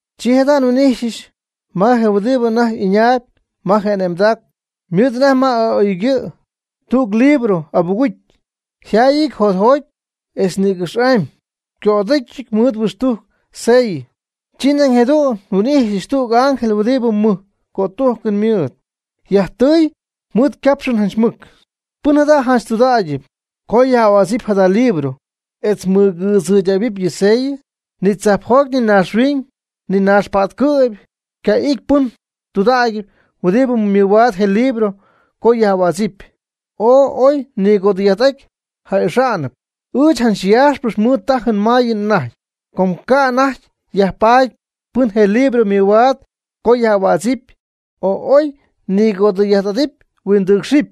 Chi jada' nhuin'ijxyɨch ma je huɨdibɨ anajty ɨñaayb ma je ane'mdac mɨɨdɨty anajty ma y'a'oygɨ' tüg libro abugucy, yjaayɨty jotjoty'amy etz nïgɨxy'amy, yco'aducyɨty mɨɨd huixtujc sellɨ. Chi nañ jadu'n nhuin'ijxyɨch tüg ángel huɨdibɨ mɨj cötujcɨn mɨɨd, yajtɨy mɨɨd ycapxɨn janch mɨc: ―¿Pɨn jada' janch tudägyɨp co yaj'ahuädzɨp jada libro etz mɨgɨɨdzɨydähuɨpy yɨ ysellɨ? Ni tzajpjoty, ni naaxhuiñ, ni naaxpa'tcɨ'py ycacá'ɨty pɨn tudägyɨp huɨdibɨ mɨhuaad je libro co yaj'ahuädzɨp, o oy nɨgoodɨ'ajty ja'ixaanɨp. Ɨɨch janch yaaxpɨch mɨɨd tajɨn mayɨn anajty, com ca' anajty yajpaady pɨn je libro mɨhuaad co yaj'ahuädzɨp, o oy nɨgoodɨ'ajty huindɨɨcxɨp.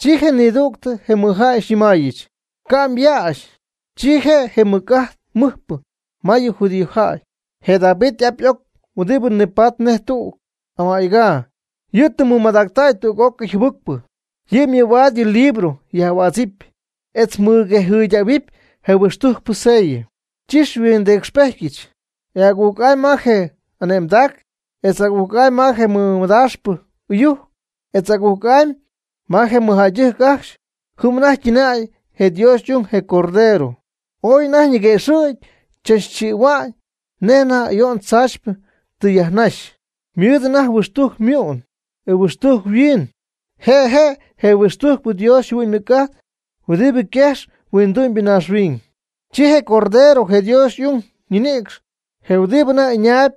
Chi nidüg je mɨjjäy xyñɨmaayɨch: ―Ca' myäxy. Chi je' je mɨc'ajt mɨɨdpɨ ma yɨ judíojäy, je David y'ap y'oc huɨdibɨ nipatp nej tüg ama'ycaa, yɨ' tɨ mɨmadactäy tüg'ócɨy jɨbɨcpɨ. Yɨ' mɨhuaad yɨ libro yaj'ahuädzɨp, etz mɨguejɨydähuɨpy je huixtujcpɨ ysellɨ. Chi nhuindɨcxpejtyɨch, e agujc'amy ma je ane'mdacɨn, etz agujc'amy ma je mɨdaaxpɨ ɨyujc, etz agujc'amy ma je mɨjjäydɨjc ajcxy, jɨm anajty ytɨnäy je Dios y'ung, je Cordero. Ooy anajty ñiguëxɨ̈gy chaachɨ̈'au nej anajty ayo'n tzaachypɨ tɨ yajnaxy. Ymɨɨd anajty huixtujc ymu'n, e huixtujc yhuiin, je' je' je huixtujcpɨ Dios yjɨhuɨ'ñ ymɨc'ajt huɨdibɨ yquejx huindu'my naaxhuiñ. Chi je Cordero, je Dios y'ung, ninɨcxy je huɨdibɨ anajty ɨñaayb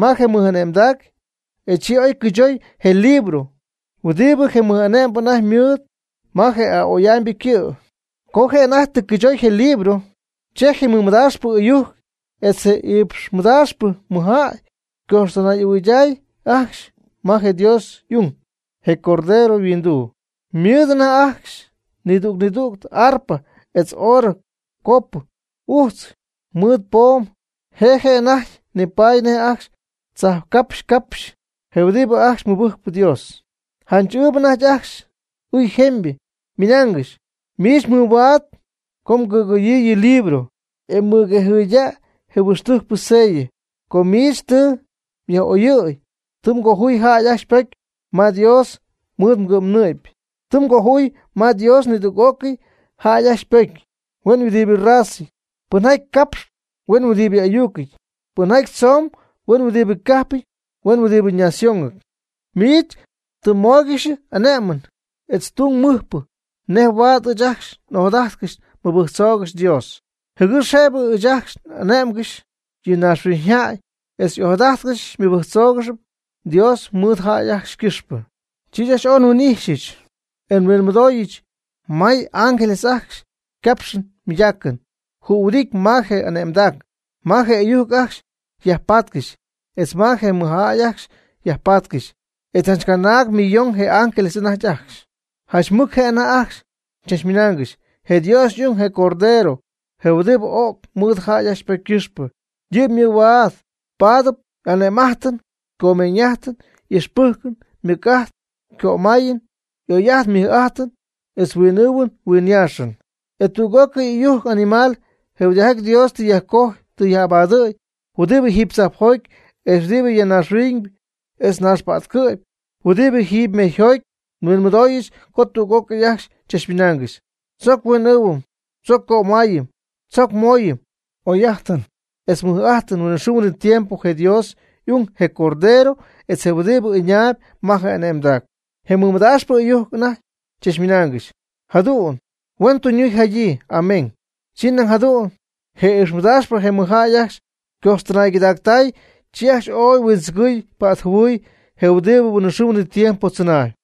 ma je mɨj'ane'mdac, e chi oy cɨychoy je libro huɨdibɨ je mɨj'ane'mbɨ anajty ymɨɨd ma je a'oy'amybɨ ycɨ'. Co je' anajty tɨ cɨychoy je libro, chi je mɨdaaxpɨ ɨyujc etz je iipxmɨdaaxpɨ mɨjjäy ycojxtɨnay'ahuɨyday ajcxy ma je Dios y'ung, je Cordero, yhuinduu. Ymɨɨd anajty ajcxy nidüg nidüg y'arpa etz oorɨ copɨ ujtzɨty mɨɨd poom, je' je' anajty nipaady nej ajcxy chajpcapxy capxy je huɨdibɨ ajcxy mɨbɨjcp Dios. Janch y'ɨɨyb anajty ajcxy ɨy jemybɨ, ymɨnaangɨxy: Miich mɨhuaad co mgɨyɨ̈gy yɨ libro, e mmɨguejɨydaayɨ je huixtujcpɨ ysellɨ. Com miich tɨ myaj'ögyii, tɨ mgojuy jäy ajcxy ypocy ma Dios mɨɨd mgɨ'mnɨ'py. Tɨ mgojuy ma Dios nidüg'ócɨy jäy ajcxy ypocy, huen huɨdibɨ razɨty, pɨnjaty capx huen huɨdibɨ ayucɨty, pɨnjaty tzomb huen huɨdibɨ cajpɨty huen huɨdibɨ naciónɨty. Miich tɨ xymóoygɨxyɨch ane'mɨn etz je tung mɨjpɨ nej huaad ɨɨch ajcxy n'ojadajtcɨxy nmɨbɨjctzoogɨxy Dios, jɨgɨx jëbɨ ɨɨch ajcxy n'ane'mgɨxy yɨ naaxhuiñyjäy etz n'ojadajtcɨxy nmɨbɨjctzoogɨxy Dios mɨɨd jäy ajcxy ycɨxpɨ. Chi ɨɨch oy nhuin'ixyɨch e nhuinmɨdooyɨch may ángeles ajcxy ycapxɨn ymɨydaacɨn jühuɨdity ma je ane'mdac, ma je ɨyujc ajcxy yajpatcɨxy, etz ma je mɨjjäy ajcxy yajpatcɨxy. E janch canaag millon je ángeles anajty ajcxy. Janch mɨc je' anajty ajcxy chachmɨnaangɨxy: Je Dios y'ung, je Cordero, je huɨdibɨ öc mɨɨd jäy ajcxy ypocy ycɨxpɨ, yɨ' mɨhuaad paadɨp ane'm'ajtɨn, comeeñ'ajtɨn, ixpɨjcɨn, mɨc'ajt, cömayɨn, oy'ajt mɨj'ajt, etz huin'ɨɨhuɨn huinyaaxɨn. E tüg'ócɨy ɨyujc animal je huɨdijaty Dios tɨ yajcojy tɨ yaj'abadɨ̈y huɨdibɨ jiiby tzajpjoty, etz huɨbɨ ya naaxhuiñ etz naaxpa'tcɨ'py, huɨdibɨ jiiby mejyjoty, nhuinmɨdooyɨch co tüg'ócɨy ajcxy chachmɨnaangɨxy: Tzoc huin'ɨɨhuɨm tzoc cömayɨm, tzoc mooyɨm oy'ajtɨn etz mɨj'ajtɨn huinɨxɨɨ huinɨtiempo je Dios y'ung, je Cordero, etz je huɨdibɨ ɨñaayb ma je ane'mdaacɨn. Je mɨdaaxpɨ ɨyujc anajty chachmɨnaangɨxy: ―Jadu'n huen tuñyii jadyii. Amén. Chi nañ jadu'n je iipxmɨdaaxpɨ je mɨjjäy ajcxy ycojxtɨnaygɨdactay, chi ajcxy ooy huindzɨgɨɨy patjɨhuɨɨy je huɨdibɨ huinɨxɨɨ huinɨtiempo tzɨnaayb.